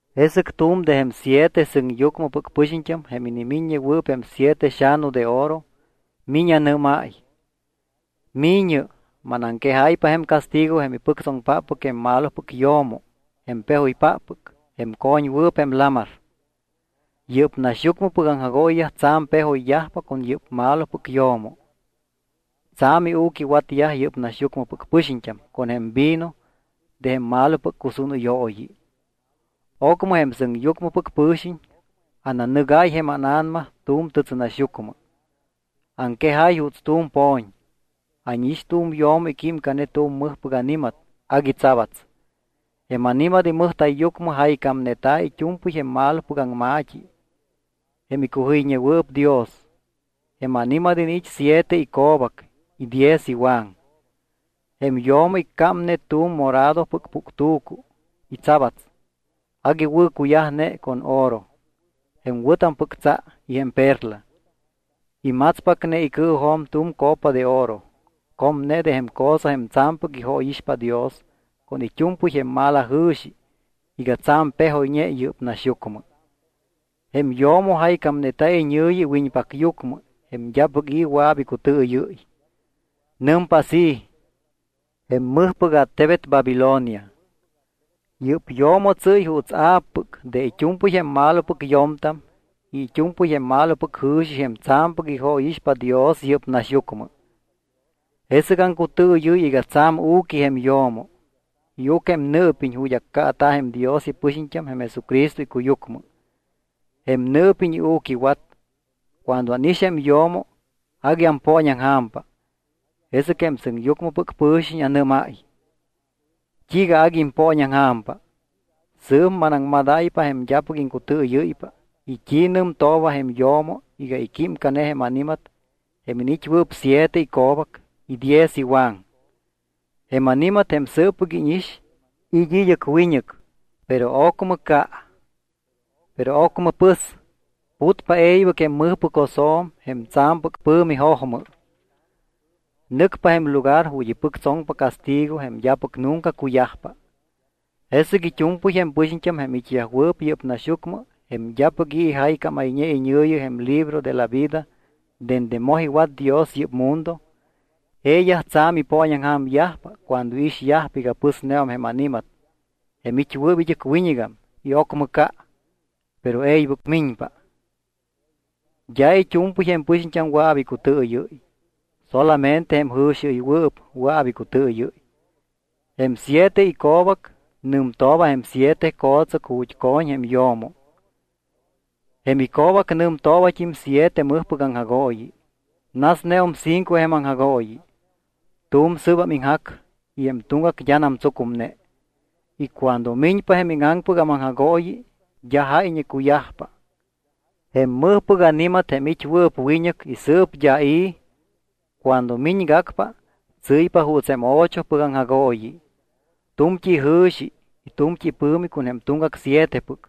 Jesɨc tu̱m de jém siete sɨŋyucmɨpɨc pɨxiñt́am jém inimiññewɨɨp jém siete xa̱nu de oro miñ anɨ́máy: —Mi̱ñɨ. Manaŋquejáypa jém castigo jém ipɨctsoŋpáppɨc jém malopɨc yo̱mo jém pejoypáppɨc jém co̱ñwɨɨp jém lamar. Yɨ́p naxyucmɨpɨc aŋjagooyiyaj tsa̱m pejoyyajpa con yɨ́p malopɨc yo̱mo. Tsa̱m iu̱quiwatyaj yɨ́p naxyucmɨpɨc pɨxiñt́am con jém vino de jém malopɨc cusúnɨyooyi. Ocmɨ jém sɨŋyucmɨpɨc pɨ̱xiñ ananɨgáy jém ána̱nama tu̱m tɨtsɨnaxyucmɨ. Aŋquejáy juuts tu̱m po̱ñ. Ánix tu̱m yo̱mo iquímcane tu̱m mɨjpɨc ani̱mat agui tsabats. Jém ani̱mat imɨjta̱yyucmɨ jaycámneta̱ it́u̱mpɨy jém malopɨc aŋma̱t́i jém icujɨyñewɨɨp Dios. Jém ani̱mat iniit́ siete ico̱bac y diez iwaŋ. Jém yo̱mo iccámne tu̱m moradopɨc puctu̱cu y tsabats. Agui wɨ̱ cuyajne con oro, jém wɨ̱tampɨc tsa y jém perla. Imatspacne icɨɨjo̱m tu̱m copa de oro comne de jém cosa jém tsa̱mpɨc ijóyixpa Dios con it́u̱mpɨy jém malajɨ̱xi iga tsa̱m pejoyñe yɨ́p naxyucmɨ. Jém yo̱mo jaycámneta̱ iñɨ̱yi iwiñpacyucmɨ jém d́apɨc i̱ wɨa̱p icutɨɨyɨ́y. Nɨmpa así: “Jém mɨjpɨc attebet Babilonia. Yɨ́p yo̱mo tsɨ́y juuts a̱ppɨc de it́u̱mpɨy jém malopɨc yo̱mtam y it́u̱mpɨy jém malopɨc jɨ̱xi jém tsa̱mpɨc ijóyixpa Dios yɨ́p naxyucmɨ.” Jesɨc aŋcutɨɨyɨ́y iga tsa̱m u̱qui jém yo̱mo. Iuc jém nɨɨpiñ ju̱t́ accaata̱ jém Dios ipɨxiñt́am jém Jesucristo icuyucmɨ. Jém nɨɨpiñ iu̱quiwat. Cuando ánix jém yo̱mo agui ampooñaŋja̱mpa. Jesɨc jém sɨŋyucmɨpɨc pɨ̱xiñ anɨ́máy: —¿T́iiga agui impooñaŋja̱mpa? Sɨɨp manaŋmadáypa jém d́apɨc iŋcutɨɨyɨ́ypa y t́i nɨmtooba jém yo̱mo iga iquímcane jém ani̱mat jém iniit́wɨɨp siete ico̱bac y diez iwaŋ. Jém ani̱mat jém sɨɨppɨc íñix, it́ id́ɨc wiñɨc, pero ocmɨ ca. Pero ocmɨ pɨs, putpa e̱ybɨc jém mɨjpɨc josjo̱m jém tsa̱mpɨc pɨ̱mi jojmɨ. Nɨcpa jém lugar ju̱t́ ipɨctsoŋpa castigo jém d́apɨc nunca cuyajpa. Jesɨc it́u̱mpɨy jém pɨxiñt́am jém it́yajwɨɨp yɨ́p naxyucmɨ jém d́apɨc i̱ ijaycámayñe iñɨ̱yi jém libro de la vida dende moj iwat Dios yɨ́p mundo, jeeyaj tsa̱m ipooñaŋja̱myajpa cuando iixyajpa iga pɨsneum jém ani̱mat jém it́wɨɨp id́ɨc wiñɨgam y ocmɨ ca, pero e̱ybɨc miñpa. ’D́a it́u̱mpɨy jém pɨxiñt́am wɨa̱p icutɨɨyɨ́y, solamente jém jɨ̱xiɨywɨɨp wɨa̱p icutɨɨyɨ́y. Jém siete ico̱bac nɨmtooba jém siete co̱tsɨc ju̱t́ co̱ñ jém yo̱mo. Jém ico̱bac nɨmtoobat́im siete mɨjpɨc aŋjagooyi. Nasneum cinco jém aŋjagooyi. Tu̱m sɨɨbam iŋjac y jém tuŋgac d́anam tsucumne. Y cuando miñpa jém íŋaŋpɨgam aŋjagooyi d́a jáyñe cuyajpa. Jém mɨjpɨc ani̱mat jém it́wɨɨp wiñɨc y sɨɨp d́a i̱, cuando miñgacpa, tsɨ́ypa juuts jém ochopɨc aŋjagooyi. Tu̱mt́i ijɨ̱xi y tu̱mt́i ipɨ̱mi con jém tuŋgac sietepɨc.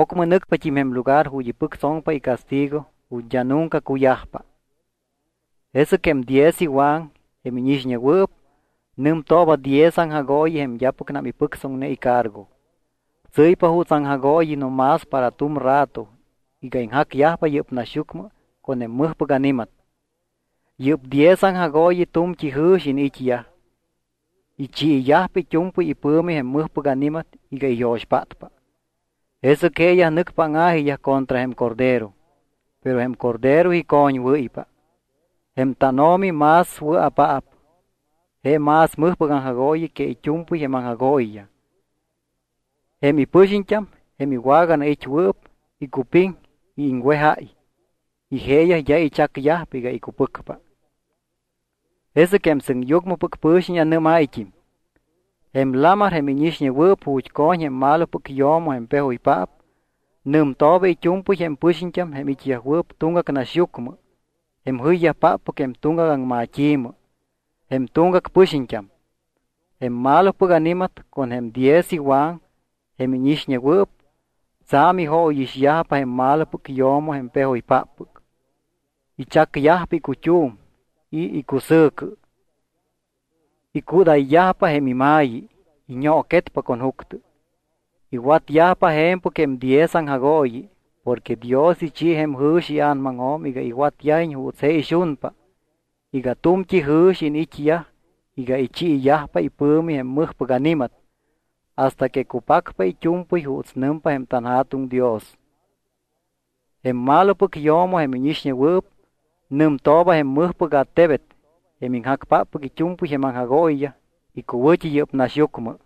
Ocmɨ nɨcpat́im jém lugar ju̱t́ ipɨctsoŋpa icastigo ju̱t́ d́a nunca cuyajpa. ’Jesɨc jém diez iwaŋ, jém íñixñewɨɨp, nɨmtooba diez aŋjagooyi jém d́apɨcnam ipɨctsoŋne icargo. Tsɨ́ypa juuts aŋjagooyi no más para tu̱m rato iga iŋjacyajpa yɨ́p naxyucmɨ con jém mɨjpɨc ani̱mat. Yɨ́p diez aŋjagooyi tu̱mt́i jɨ̱xi iniit́yaj. Ichiiyajpa it́u̱mpɨy ipɨ̱mi jém mɨjpɨc ani̱mat iga iyo̱xpátpa. Jesɨc jeeyaj nɨcpa áŋa̱jiyaj contra jém Cordero. Pero jém Cordero icoñwɨ́ypa. Jém tánO̱mi más wɨa̱paap, je más mɨjpɨc aŋjagooyi que it́u̱mpɨy jém aŋjagooyiyaj. Jém ipɨxiñt́am, jém iwaganait́wɨɨp, icupiŋ y iŋwejáy. Y jeeyaj d́a ichacyajpa iga icupɨcpa. Jesɨc jém sɨŋyucmɨpɨc pɨ̱xiñ anɨ́máyt́im: —Jém lamar jém íñixñewɨɨp ju̱t́ co̱ñ jém malopɨc yo̱mo jém pejoypaap nɨmtooba it́u̱mpɨy jém pɨxiñt́am, jém it́yajwɨɨp tuŋgac naxyucmɨ, jém jɨyyajpáppɨc jém tuŋgac aŋmat́i̱mɨ, jém tuŋgac pɨxiñt́am. Jém malopɨc ani̱mat con jém diez iwaŋ, jém íñixñewɨɨp, tsa̱m ijóyixyajpa jém malopɨc yo̱mo jém pejoypáppɨc. Ichacyajpa icut́um y cusɨ̱cɨ. Icúdayyajpa jém ima̱yi. Iñooquetpa con juctɨ. Iwatyajpa je̱mpɨc jém diez aŋjagooyi porque Dios ichi jém jɨ̱xi ia̱namaŋjo̱m iga iwatyajiñ juuts je ixunpa iga tu̱mt́i jɨ̱xi iniit́yaj iga ichiiyajpa ipɨ̱mi jém mɨjpɨc ani̱mat hasta que cupacpa it́u̱mpɨy juuts nɨmpa jém tanJa̱tuŋ Dios. Jém malopɨc yo̱mo jém íñixñewɨɨp nɨmtooba jém mɨjpɨc attebet jém iŋjacpáppɨc it́u̱mpɨy jém aŋjagooyiyaj icuwɨ̱t́i yɨ́p naxyucmɨ.